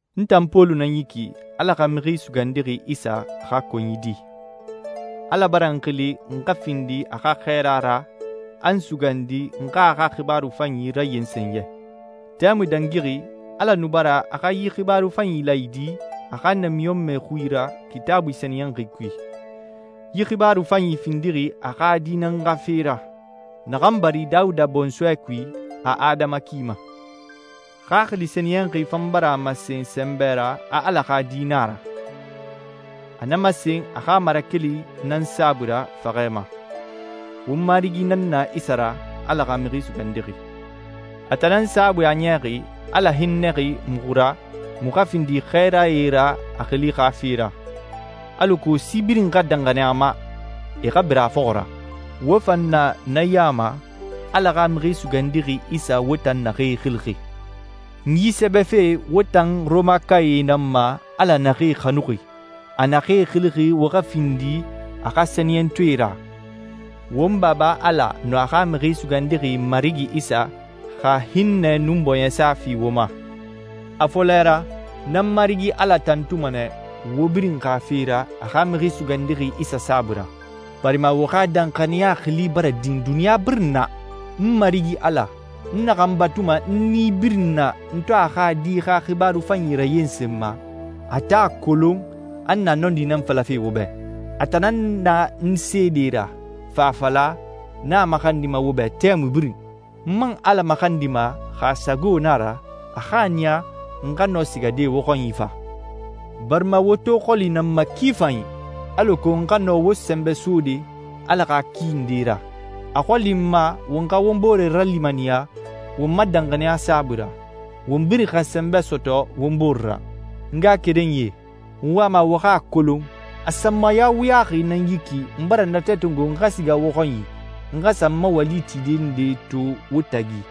N tan Pɔlu nan yi ki, Ala xa Mixi Sugandixi Isa xa konyi di. Ala bara n xili n xa findi a xa xɛɛra ra, a n sugandi n xa a xa xibaaru fanyi rayensen yɛ. Tɛmui dangixi, Ala nu bara a xa yi xibaaru fanyi laayidi a xa namiɲɔnmɛe xui ra Kitaabui sɛniyɛnxi kui. Yi xibaaru fanyi findixi a xa Di nan xa fe ra, naxan bari Dawuda bɔnsɔɛ kui a adama ki ma. Xaxili Sɛniyɛnxi fan bara a masen sɛnbɛ ra a Ala xa Di na a ra. A na masen a xa marakeli nan saabui ra faxɛ ma. Won Marigi nan na Isa ra, Ala xa Mixi Sugandixi. A tan nan saabui a niyaxi Ala hinnɛxi muxu ra muxu xa findi xɛɛrae ra a xili xa fe ra, alako si birin xa danxaniya a ma, e xa bira a fɔxɔ ra. Wo fan na na ya ma, Ala xa Mixi Sugandixi Isa wo tan naxee xilixi. N yi sɛbɛfe wo tan Rɔmakae nan ma Ala naxee xanuxi, a naxee xilixi wo xa findi a xa sɛniyɛntɔɛe ra. Won Baba Ala nun a xa Mixi Sugandixi Marigi Isa xa hinnɛ nun bɔɲɛsa fi wo ma. A fɔlɛ ra, n nan n Marigi Ala tantuma nɛ wo birin xa fe ra a xa Mixi Sugandixi Isa saabui ra, barima wo xa danxaniya xili bara din duniɲa birin na. N Marigi Ala, n naxan batuma n nii birin na n to a xa Di xa xibaaru fanyi rayensenma, a tan a kolon a n na nɔndi nan falafe wo bɛ. A tan nan n seede ra, fa a fala, n a maxandima wo bɛ tɛmui birin. N man Ala maxandima, xa a sago na a ra, a xa a niya n xa nɔ sigade wo xɔnyi fa. Barima wo to xɔli na n ma ki fanyi, alako n xa nɔ wo sɛnbɛ sode Ala xa ki ndee ra. A xɔli n ma won xa won bore ralimaniya won ma danxaniya saabui ra, won birin xa sɛnbɛ sɔtɔ won bore ra. N ngaxakerenyie, n wama wo xa a kolon a sanmaya wuyaxi nan yi ki n bara natɛ tongo n xa siga wo xɔnyi n xa sa n ma wali tide nde to wo tagi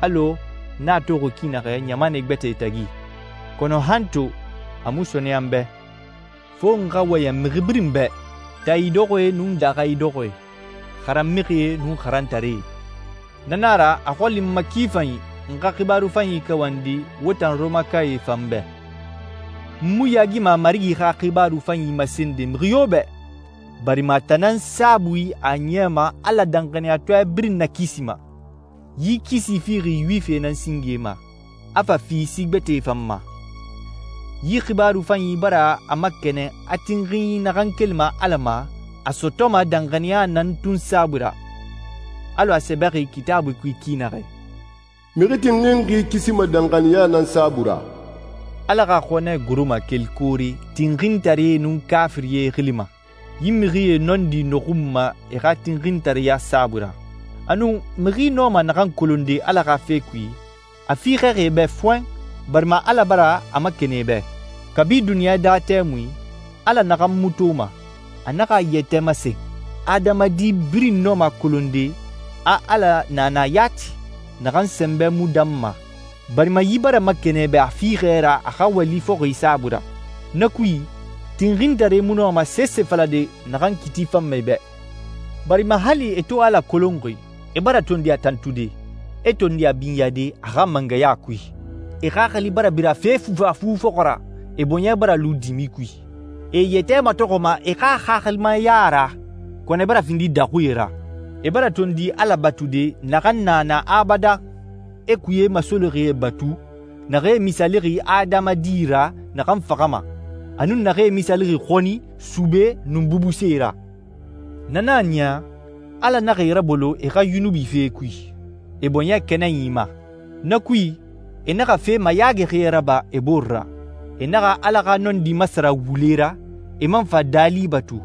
alɔ n a toxi ki naxɛ ɲamanɛ gbɛtɛe tagi, kɔnɔ han to a mu sɔɔnɛya n bɛ. Fo n xa wɔyɛn mixi birin bɛ, taa idɔxɔɛe nun daaxa idɔxɔɛe, xaran mixie nun xarantaree. Na na a ra a xɔli n ma ki fanyi n xa xibaaru fanyi kawandi wo tan Rɔmakae fan bɛ. N mu yaagima Marigi xa xibaaru fanyi masende mixi yo bɛ, barima a tan nan saabui a niyama Ala danxaniyatɔɛ birin nakisima. Yi kisi fixi Yuwifie nan singe ma, a fa fi si gbɛtɛe fan ma. Yi xibaaru fanyi bara a makɛnɛn a tinxinyi naxan kelima Ala ma a sɔtɔma danxaniya nan tun saabui ra, alɔ a sɛbɛxi Kitaabui kui ki naxɛ: «Mixi tinxinxi kisima danxaniya nan saabui ra.» Ala xa xɔnɛ goroma keli koore tinxintaree nun kaafirie xili ma. Yi mixie nɔndi nɔxunma e xa tinxintareya saabui ra. Anun mixi nɔma naxan kolonde Ala xa fe kui, a fiixɛxi e bɛ fɔɛn, barima Ala bara a makɛnɛn e bɛ. Kabi duniɲa daa tɛmui, Ala naxan mu toma, a naxa a yɛtɛ masen. Adamadi birin nɔma a kolonde a Ala na na yati, naxan sɛnbɛ mu danma, barima yi bara makɛnɛn e bɛ a fiixɛ ra a xa wali fɔxi saabui ra. Na kui, tinxintaree mu nɔma sese falade naxan kiiti fanma e bɛ, barima hali e to Ala kolonxi, e bara tondi a tantude, e tondi a binyade a xa mangɛya kui. E xaxili bara bira fe fufafu fɔxɔ ra, e bɔɲɛ bara lu dimi kui. E e yɛtɛ matɔxɔma e xa xaxilimaya ra, kɔnɔ e bara findi daxuie ra. E bara tondi Ala batude naxan na na abadan, e kuye masolixie batu naxee misaalixi adamadi ra naxan faxama, a nun naxee misaalixi xɔni, sube, nun bubuse ra. Na nan a niya Ala naxa e rabolo e xa yunubi fee kui, e bɔɲɛ kɛnɛnyi ma. Na kui, e naxa fe mayaagixie raba e bore ra. E naxa Ala xa nɔndi masara wule ra, e man fa daali batu,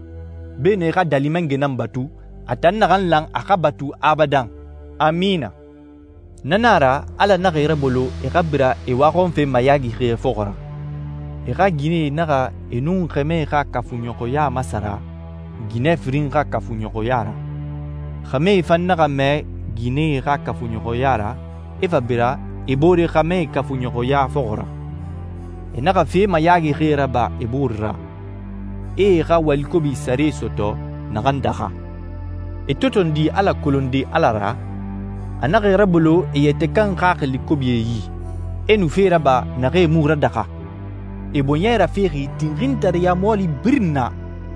beenun e xa Daali Mangɛ nan batu, a tan naxan lan a xa batu abadan. Amina. Na na a ra Ala naxa e rabolo e xa bira e waxɔnfe mayaagixie fɔxɔ ra. E xa ginɛe naxa e nun xɛmɛ xa kafuɲɔxɔya masara ginɛ firin xa kafuɲɔxɔya ra. Xɛmɛe fan naxa mɛɛ ginɛe xa kafuɲɔxɔya ra, e fa bira e boore xɛmɛe kafuɲɔxɔya fɔxɔ ra. E naxa fe mayaagixie raba e bore ra, e e xa wali kobi sare sɔtɔ naxan daxa. E to tondi Ala kolonde Ala ra, a naxa e rabolo e yɛtɛ kan xaxili kobie yi, e nu fee raba naxee mu radaxa. E bɔɲɛ rafexi tinxintareya mɔɔli birin na: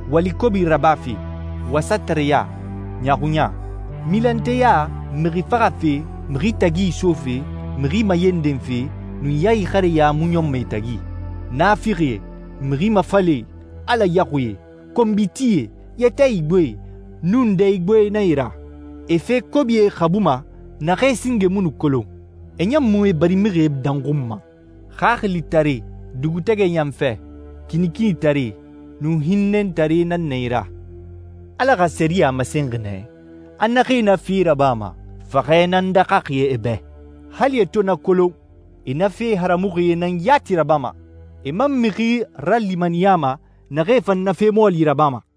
wali kobi rabafe, wasatareya, ɲaaxuɲa. Milanteya, mixi faxafe, mixi tagi isofe, mixi mayendenfe, nun ya ixareya mu ɲɔnma e tagi. Naafixie, mixi mafalɛe, Ala yaxuie, konbitie, yɛtɛ igboee nun dɛ igboee nan e ra. E fe kobie xabuma naxee singe mu nu kolon, e ɲan mu e barimixie danxunma. Xaxilitare, dugutɛgɛ yanfɛ, kinikinitare, nun hinnɛtare nan na e ra. Ala xa sɛriyɛ a masenxi nɛ, a naxee na fee rabama, faxɛ nan daxaxi e bɛ. Hali e to na kolon, e na fe haramuxie nan yati rabama, e man mixi ralimaniyama naxee fan na fe mɔɔli rabama.